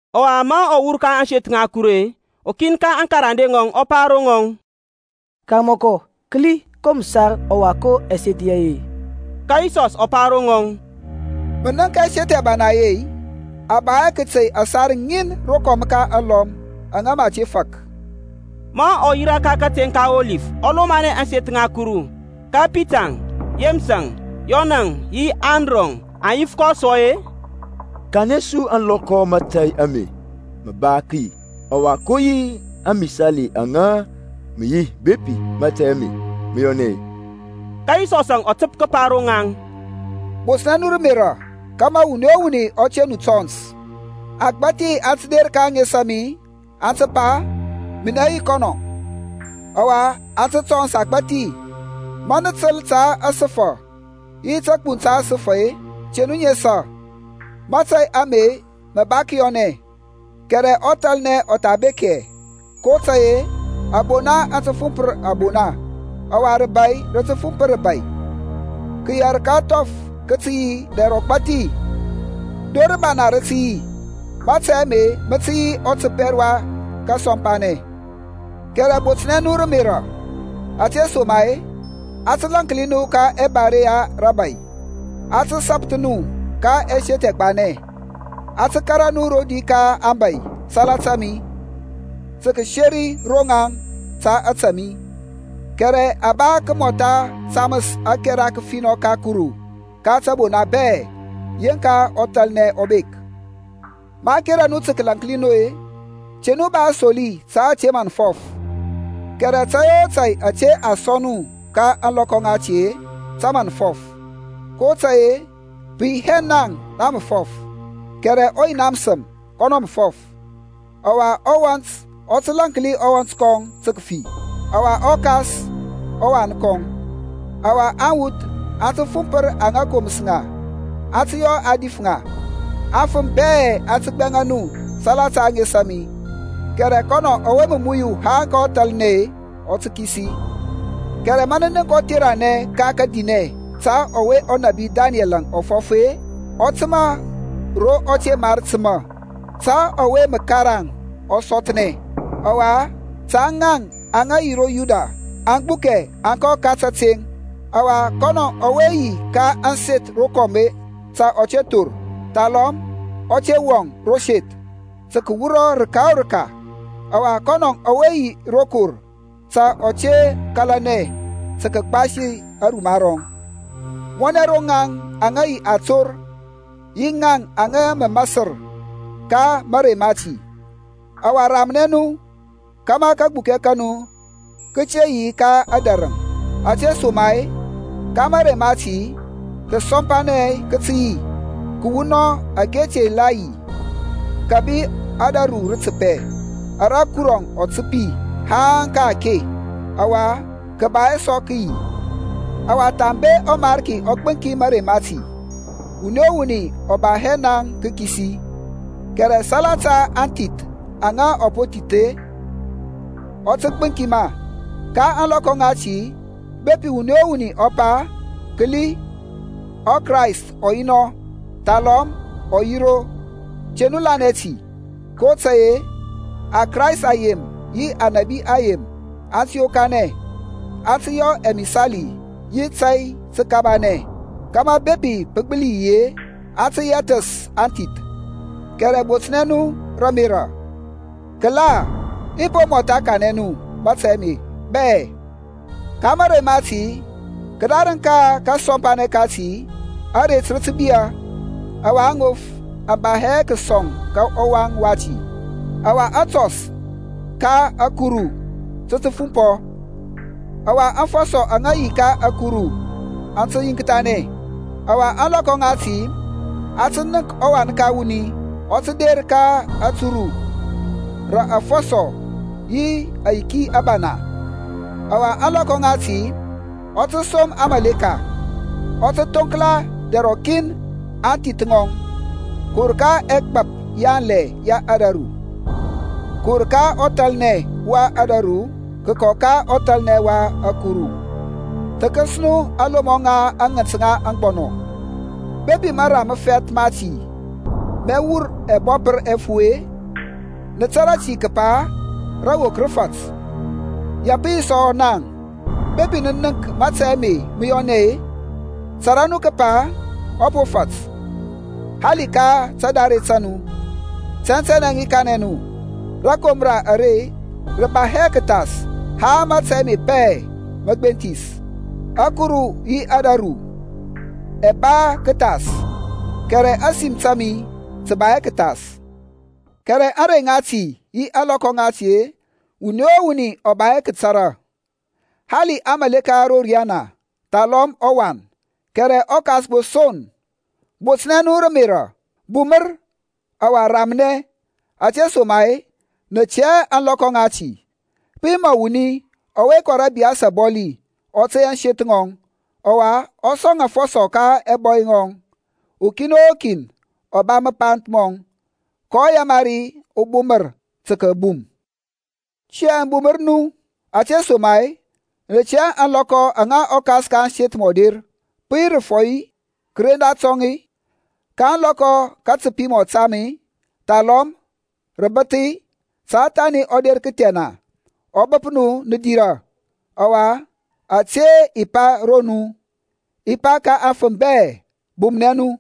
Ɔwa ma ɔ wur ka ȧŋseth ŋa Kuru-e, ukin ka aŋkarande ŋɔŋ ɔ pa ro ŋɔŋ, Karmɔkɔ, kəli, ko məsar ɔwa ko ɛseth yeye! Ka Yisɔs ɔ pa ro ŋɔŋ, Mə nənk ɛseth ɛbana ɛye-i? A ba hɛ kəte yȧsar ŋin rokɔm ka alɔm aŋa mə a te fak. Ma ɔ yirȧ ka kateŋ ka Ɔlif ɔ lomanɛ ȧŋseth ŋa Kuru, ka Pitaŋ, Yeməsȧŋ, Yɔnȧŋ yi Andrɔŋ aŋ yif kɔ sɔ-e, Kanɛ su ȧŋlɔkɔ mȧtȧy ame mə ba kəyi, ɔwa ko yi amisali aŋa mə yi bepi mȧtȧy ame mə yɔnɛ-e? Ka Yisɔsȧŋ ɔ təp kəpa ro ŋaŋ, Botnɛ nu rə ȧmerȧ kȧmȧ wuni o wuni ɔ te nu tɔns. Agbathi aŋ tə der ka ȧŋes a mi, aŋ tə pa, Minɛ yi kɔnɔ; ɔwa aŋ tə tɔns agbȧthi. Ma nə təl ta səfa yi təgbuŋ ta səfa-e, te nu nesa. Mȧtȧy ame mə ba kəyɔnɛ, kɛrɛ ɔthalnɛ ɔ tha bek hɛ. kotȧy-e abona aŋ tə fumpɔ abona, ɔwa rəbȧy rə tə fumpɔ rəbȧy; kəyɛr ka ȧŋthɔf kə tə yi dɛr ɔgbȧthi. Dor rəbana rə tə yi. Mȧtȧy ame mə tə yi ɔtəpɛr wa kasɔmpanɛ. Kɛrɛ botnɛ nu rə ȧmerȧ, ȧtesoma-e a tə lȧnki nu ka ɛbare ya rəbȧy; a tə sapəth nu ka ɛseth ɛgbanɛ; a tə kȧrȧ nu rodi ka aŋbȧy salata mi, tə kəseri ro ŋaŋ ta ȧtȧ mi. Kɛrɛ a ba kəmɔtha taməs ȧkɛra kəfinɔ ka Kuru ka tȧbona bɛ yeŋka ɔthalnɛ ɔ bek. Maŋ kera nu tə kəlaŋkli nu-e, te nu ba asoli ta ȧtȧ mə nə fɔf, kɛrɛ tȧy o tȧy ȧtȧ a sɔŋ nu ka ȧŋlɔkɔ ŋati-e, tə mə nə fɔf, kotȧy-e, pə yi hɛ naŋ nə mə fɔf, kɛrɛ ɔ Yina məsəm kɔnɔ mə fɔf. Ɔwa uwɔnt ɔ tə lȧnki uwɔnt tə kəfi, ɔwa ɔkas ɔwan kɔŋ; ɔwa aŋwuth aŋ tə fumpər aŋa koməs ŋa, aŋ tə yɔ a dif ŋa. Aŋfəm bɛ aŋ tə gbɛŋa nu salata ȧŋes a mi; kɛrɛ kɔnɔ ɔwe mə muyu haŋ ka ɔthalnɛ-e, mə kisi. Kɛrɛ ma nə nənk ɔtheranɛ ka kədinɛ ta ɔwe ɔnȧbi Danɛl ɔ fɔf-e ɔ təmȧ ro ɔ te mar təmȧ, (ta ɔwe mə karaŋ ɔ sɔthnɛ) ɔwa ta ŋaŋ aŋa yi ro Yuda aŋ gbukɛ aŋ kɔ ka tȧteŋ; ɔwa kɔnɔ ɔwe yi ka ȧŋseth rokɔm ta ɔ te thor, thalɔm ɔ te wɔŋ ro seth tə kəwura rəka o rəka. Ɔwa kɔnɔ ɔwe yi ro kɔr ta ɔ te kȧlanɛ tə kəgbasi aruma rɔŋ. Mɔnɛ ro ŋaŋ aŋa yi ator yi ŋaŋ aŋa masər ka mȧrey mati! Ɔwa ramnɛ nu kȧmȧ kagbukɛ ka nu kə te yi ka ȧdȧrəŋ. Ȧtesoma-e ka mȧrey mati kəsɔmpanɛ kə tə yi, kəwunɔŋ ȧke te tha yi kȧbi ȧdȧru rə təpɛ ara Kuru ɔ təpi haŋ ka-ake, ɔwa kə ba hɛ sɔ kəyi. Ɔwa, thambe ɔMarki ɔ gbəŋki mȧrey mati, wuni o wuni ɔ ba hɛ naŋ tə kəkisi; kɛrɛ salata aŋthith aŋa ɔ po thithəs-e, ɔ tə gbəŋki ma. Ka ȧŋlɔkɔ ŋati bepi wuni o wuni ɔ pa, Kəli, ɔKrayst ɔ yi nɔ; thalɔm ɔ yi ro. Te nu lanɛ ti, kotȧy-e aKrayst ayem yi anȧbi ayem aŋ tə yokanɛ, aŋ tə yɔ ɛmisali yi tȧy təkabanɛ, kȧmȧ bepi pə gbəli yi-e, aŋ tə yɛthəs aŋthith. Kɛrɛ botnɛ nu rə ȧmerȧ. Kəla i po mɔtha kanɛ nu mȧtȧy bɛ. Ka mərey mati, kədarəŋ ka kasɔmpanɛ kati, aret rə tə biyȧ, ɔwa aŋof aŋ ba hɛ kəsɔŋ ɔwaŋ wati. Ɔwa atɔs ka ȧkuru tə tə fumpɔ ɔwa aŋfɔsɔ aŋa yi ka ȧkuru aŋ tə yiŋkthanɛ. Ɔwa ȧŋlɔkɔ ŋati aŋ tə nənk ɔWan ka wuni ɔ tə der ka aturu rə afɔsɔ yi ayiki abana. Ɔwa ȧŋlɔkɔ ŋati ɔ tə som aŋmȧleka, ɔ tə thoŋkla dɛr rɔkin aŋthith ŋɔŋ kəwur ka ɛgbap yanlɛ ya ȧdȧru, kəwur ka ɔthalnɛ wa ȧdȧru kəkɔ ka ɔthalnɛ wa ȧkuru. Thəkəs nu alomɔ ŋa aŋənt ŋa aŋgbɔnɔ; bepi mara məfɛth mati mɛ wur ɛbɔpər ɛfu-e, nə tȧrȧ ti kəpa rawok rə fat. Ya pə yi sɔ naŋ, bepi nə nənk mȧtȧy ame mə yɔnɛ-e, tȧrȧ nu kəpa ɔ po fat, hali ka tadare ta nu. Tɛntɛnɛ i kanɛ nu, rȧkomra are rə ba hɛ kəthas haŋ mȧtȧy ame bɛ mə gbenthis. Ȧkuru yi ȧdȧru ɛ ba kəthas; kɛrɛ ȧsim ta mi tə ba hɛ kəthas. Kɛrɛ ȧŋrey ŋati yi ȧŋlɔkɔ ŋati-e wuni o wuni ɔ ba hɛ kətara, hali aŋmȧleka ro riyana thalɔm ɔWan, kɛrɛ ɔKas gbo son. Botnɛ nu rə ȧmerȧ, bumər ɔwa ramnɛ, ȧtesoma-e nə tɛ hɛ ȧŋlɔkɔ ŋati. Pə yi mɔ wuni ɔwe kɔ rə ȧbiyas abɔli ɔ tey ȧŋseth ŋɔŋ, ɔwa ɔ sɔŋ afɔsɔ ka ɛbɔy yɔŋ, ukin o kin ɔ ba mapanth mɔŋ, kɔ yamari ɔbumər tə kəbum. Tiyȧŋ bumər nu, ȧtesoma-e nə tɛ hɛ ȧŋlɔkɔ aŋa ɔkas ka ȧŋseth mɔ der, pə yi rəfɔy-e, kəren datɔŋ-e, ka ȧŋlɔkɔ kətəpi mɔ tam-e, thalɔm rəbəth; ta thani ɔ der kəthɛna ɔ bəp nu nə dirȧ. Ɔwa ȧte i pa ro nu, i pa ka aŋfəm bɛ. Bumnɛ nu.